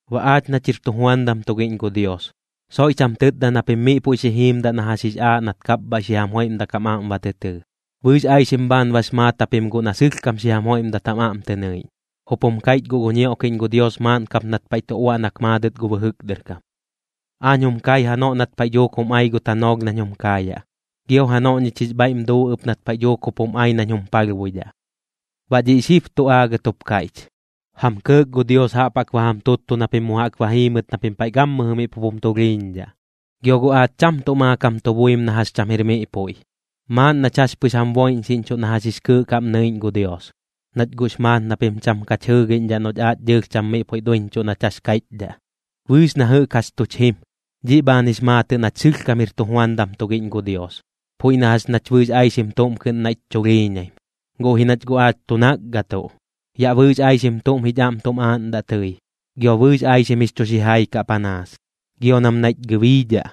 Baꞌ aach nach jir tujuandam tugiꞌñ gu Dios, soiꞌch jam tɨtda na pim miꞌ puiꞌ xi jiimdaꞌ na jax jix aaꞌ nat kapbhaiꞌ xi jam joiꞌmdak jam aꞌm ba tɨ tɨɨ, bɨɨx aixim bhaan bax maat japim guꞌ na sɨlhkam xi jam joiꞌmdat jam aꞌm tɨ nɨiꞌñ. Jup jum kaiꞌch guꞌ gu ñioꞌkiꞌñ gu Dios maaꞌn kap nat paiꞌ tu uaꞌnak maadɨt gu bɨjɨk dɨr kam: Aañ jum kai janoꞌ nat paiꞌ dhuuk jum ai gu tanoolh nañ jum kaayaꞌ, gio janoꞌ ñich jix bhaiꞌm duu ɨp nat paiꞌ dhuuk jup jum ai nañ jum palhbuidhaꞌ. Baꞌ dhiꞌ xib tu aagɨt jup kaiꞌch, jam kɇɇk gu Dios jaꞌp jaꞌk ba jam tuttu na pim mu jaꞌk ba jiimɨt na pim paiꞌ gammɨjɨ miꞌ pup jum tulhiiñdhaꞌ. Gio guꞌ aach cham tuꞌ maakam tu buim na jax cham jir miꞌ puiꞌ, maaꞌn nach jax pɨx jam boiꞌñxiꞌñchuꞌ na jax jix kɨɨꞌ kaꞌm nɨiꞌñ gu Dios, nach guꞌx maat na pim cham kach jɨɨgiꞌñdhaꞌ noꞌch aach dɨɨlh cham miꞌ puiꞌ duiñchuꞌ nach jax kaiꞌchdhaꞌ. Bɨɨx na jɨꞌk jax tuch jim, dhiꞌ bhaan jix maatɨꞌ nach sɨlhkam jir tujuandam tugiꞌñ gu Dios, puiꞌ na jax nach bɨɨx aixim tuꞌm kɨꞌn naiꞌch chulhiiñaim, guꞌ ji nach guꞌ aach tu nakgatuꞌ. Yaꞌ bɨɨx aixim tuꞌm jich aꞌm tum aaꞌndaꞌ tɨi, gio bɨɨx aixim jix chu xijai kaꞌ panaas. Gio nam naiꞌch gɨbiidhaꞌ,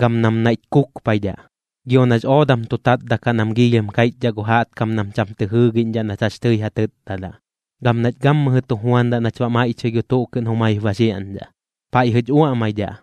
gam nam naiꞌch kukpaidhaꞌ. Gio nax oodam tu tatdaꞌ kaꞌ nam giilhim kaiꞌchdhaꞌ gu jaꞌtkam nam cham tɨ jɨɨgiꞌñdhaꞌ nach jax tɨi ja tɨtdadaꞌ. Gam nach gammɨjɨ tu juandaꞌ nach baꞌ maiꞌchɨi gu tuꞌ kɨꞌn jumaip ba xiaꞌñdhaꞌ, paiꞌjɨch uaꞌmaidhaꞌ,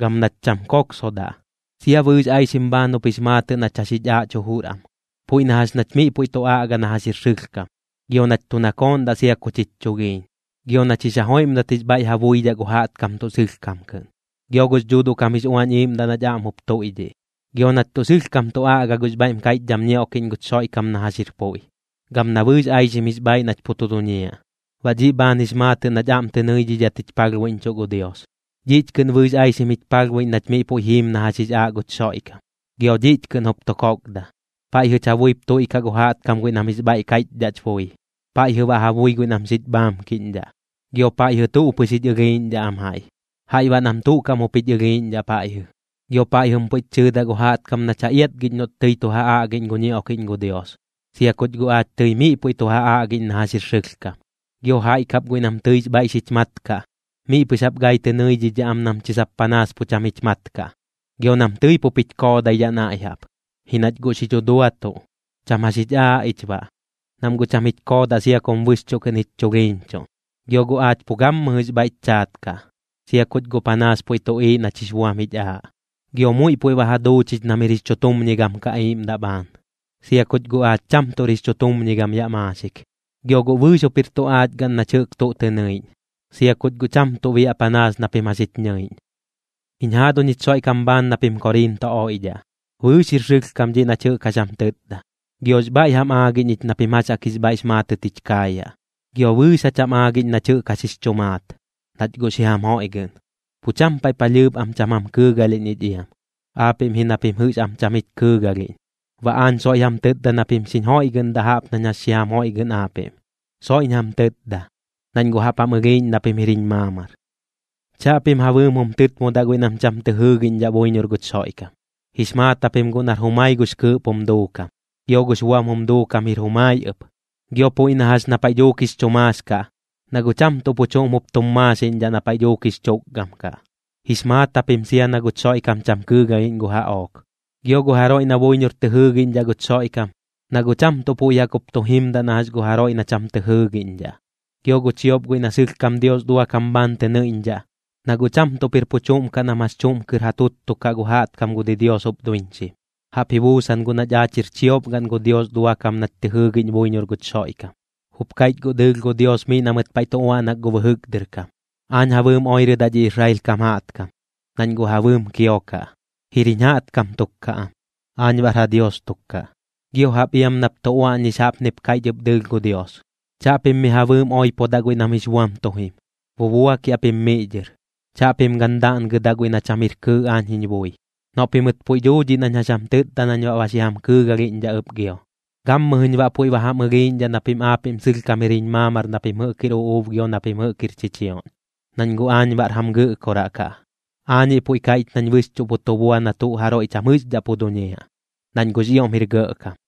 gam nach cham koksodaꞌ. Sia bɨɨx aixim bhaan jup jix maatɨꞌ nach jax jich aaꞌch jujur am, puiꞌ na jax nach miꞌ puiꞌ tu aꞌga na jax jir sɨlhkam, gio nach tu nakooꞌndaꞌ sia kuch jich chulhiiñ, gio nach jix ja joiꞌmdat jix bhaiꞌ ja buidhaꞌ gu jaꞌtkam tuꞌ sɨlhkam kɨꞌn, gio gux Dhuuduꞌ kam jix Uañ Iiꞌmdaꞌ nach aꞌm jup tuiꞌdhiꞌ. Gio nach tuꞌ sɨlhkam tu aꞌga gux bhaiꞌm kaiꞌchdham ñioꞌkiꞌñ guch Xoiꞌkam na jax jir puiꞌ, gam na bɨɨx aixim jix bhaaiꞌ nach pu tu duñiaꞌ, baꞌ dhiꞌ bhaan jix maatɨꞌ nach aꞌm tɨ nɨidhidhat jich palhbuiꞌñchuꞌ gu Dios. Dhiꞌch kɨꞌn bɨɨx aixim jich palhbuiꞌñ nach miꞌ puiꞌ jiim na jax jix aaꞌ guch Xoiꞌkam, gio dhiꞌch kɨꞌn jup tu kokda. Paiꞌjɨch ja buip tuiꞌkaꞌ gu jaꞌtkam guiꞌ nam jix bhaiꞌ kaiꞌchdhaꞌch bui, paiꞌjɨ baꞌ ja bui guiꞌ nam xich bhaamkiꞌñdhaꞌ. Gio paiꞌjɨ tuꞌ pɨx jich ɨlhiiꞌñdhaꞌ am jaiꞌ, jaiꞌ baꞌ nam tuꞌ kaꞌm jup jich ɨlhiiꞌñdhaꞌ paiꞌjɨ. Gio paiꞌjɨm puiꞌch chɨɨdaꞌ gu jaꞌtkam nach ja iatgiꞌñ noꞌch tɨi tu ja aꞌgiꞌñ gu ñioꞌkiꞌñ gu Dios, sia kuch guꞌ aach tɨi miꞌ puiꞌ tu ja aꞌgiꞌñ na jax jir sɨlhkam. Gio jaiꞌ kap guiꞌ nam tɨix bhaiꞌ xich mat kaꞌ, miꞌ pɨx jaꞌp gai tɨ nɨidhidhaꞌ am nam chi sap panaas pu cham jich mat kaꞌ. Gio nam tɨi pup jich koodaidhaꞌ naiꞌ jaꞌp, ji nach guꞌ xi dhuduatuꞌ. Cham jax jich aaꞌ ich baꞌ, nam guꞌ cham jich koodaꞌ sia kum bɨxchuꞌ kɨꞌn jich chulhiiñchuꞌn. Gio guꞌ aach pu gammɨjɨx bhaiꞌch chaat kaꞌ, sia kuch guꞌ panaas puiꞌ tuꞌiiꞌ nach jix buam jich aaꞌ. Gio muiꞌ puiꞌ ba ja duu chich nam jir jix chutumñigam kaꞌ iiꞌmdaꞌ bhaan, sia kuch guꞌ aach cham tuꞌr jix chutumñigam yaꞌ maaxik. Gio guꞌ bɨɨx jup jir tu aach gaꞌn nach jɨꞌk tuꞌ tɨ nɨiꞌñ, sia kuch guꞌ cham tuꞌ biaꞌ panaas na pim jax jich ñɨiꞌñ. Jiñ jaaduñ jich Xoiꞌkam bhaan na pim Koriinto oiꞌdhaꞌ, bɨɨx jir sɨlhkam dhiꞌ nach jɨꞌk jax jam tɨtda, giox bhaiꞌ jam aagiꞌñ ich na pim jax jaꞌk jix bhaiꞌx maatɨt jich kaayaꞌ, gio bɨɨx jach jam aagiꞌñ nach jɨꞌk jax jix chu maat, nach guꞌ xi jam joiꞌgɨꞌn. Pu cham paiꞌ palhɨɨp am cham jam kɨɨgalhiꞌñ ich iam, aapiꞌm ji na pim jɨꞌx am cham jich kɨɨgalhiꞌñ. Baꞌ aañ soiꞌ jam tɨtda na pim xiñ joiꞌgɨꞌndaꞌ jaꞌp nañ jax xi jam joiꞌgɨꞌn aapiꞌm. Soiꞌñ jam tɨtda, nañ guꞌ jaꞌp jam ɨlhiiꞌñ na pim jir jiñ maamar. Chaꞌpim ja bɨɨm jum tɨtmodaꞌ guiꞌ nam cham tɨ jɨɨgiꞌñdhaꞌ buiñor guch Xoiꞌkam. Jix maat japim guꞌ nar jumai gux kɨɨꞌp jum duukam, gio gux buam jum duukam jir jumai ɨp. Gio puiꞌ na jax na paiꞌ dhuuk jix chu maax kaꞌ, na guꞌ cham tuꞌ pu chuꞌm jup tum maaxiꞌñdhaꞌ na paiꞌ dhuuk jix chukgam kaꞌ. Jix maat japim sia na guch Xoiꞌkam cham kɨɨgalhiꞌñ gu jaꞌook. Gio gu jaroiꞌ na buiñor tɨ jɨɨgiꞌñdhaꞌ guch Xoiꞌkam, na guꞌ cham tuꞌ puiꞌ jaꞌk jup tu jimdaꞌ na jax gu jaroiꞌ na cham tɨ jɨɨgiꞌñdhaꞌ. Gio gu chiop guiꞌ na sɨlhkam Dios duakam bhaan tɨ nɨiꞌñdhaꞌ, na guꞌ cham tuꞌp jir pu chuꞌm kaꞌ nam jax chuꞌm kɨr ja tuttukaꞌ gu jaꞌtkam gu didios jup duiñxim. Jaꞌp ji buusan guꞌ nach aach jir chiop gaꞌn gu Dios duakam nach tɨ jɨɨgiꞌñ buiñor guch Xoiꞌkam. Jup kaiꞌch guꞌ dɨɨlh gu Dios miꞌ na mɨt paiꞌ tu uaꞌnak gu bɨjɨk dɨr kam: Aañ ja bɨɨm oirɨdaꞌ dhi Israel kam jaꞌtkam, nañ guꞌ ja bɨɨm kiokaꞌ. Jir jiñ jaꞌtkam tuk kaꞌ am, aañ baꞌr ja Dios tuk kaꞌ. Gio jaꞌp iam nap tu uaꞌñix jaꞌpnip kaiꞌch ɨp dɨɨlh gu Dios: Chaꞌpim mi ja bɨɨm oipodaꞌ guiꞌ nam jix buam tu jim, bubuakiaꞌ pim miꞌ dhɨr. Chaꞌpim gan daꞌngɨdaꞌ guiꞌ na cham jir kɨɨꞌ aañ jiñ bui. Noꞌ pimɨt puiꞌ duu dhiꞌ nañ jax jam tɨtda nañ baꞌ ba xi jam kɨɨgalhiꞌñdhaꞌ ɨp gio. Gammɨjɨñ baꞌ puiꞌ ba jam ɨlhiiꞌñdhaꞌ na pim aapiꞌm sɨlhkam jir jiñ maamar na pim jɨꞌk jir uꞌuub gio na pim jɨꞌk jir chichioꞌñ, nañ guꞌ aañ baꞌr jam Gɨꞌkoraꞌ kaꞌ. Aañiꞌ puiꞌ kaiꞌch nañ bɨxchuꞌ pu tu bua na tuꞌ jaroiꞌ cham jɨꞌxdhaꞌ pu duñiaꞌ, nañ guꞌx ioꞌm jir gɇꞌkam.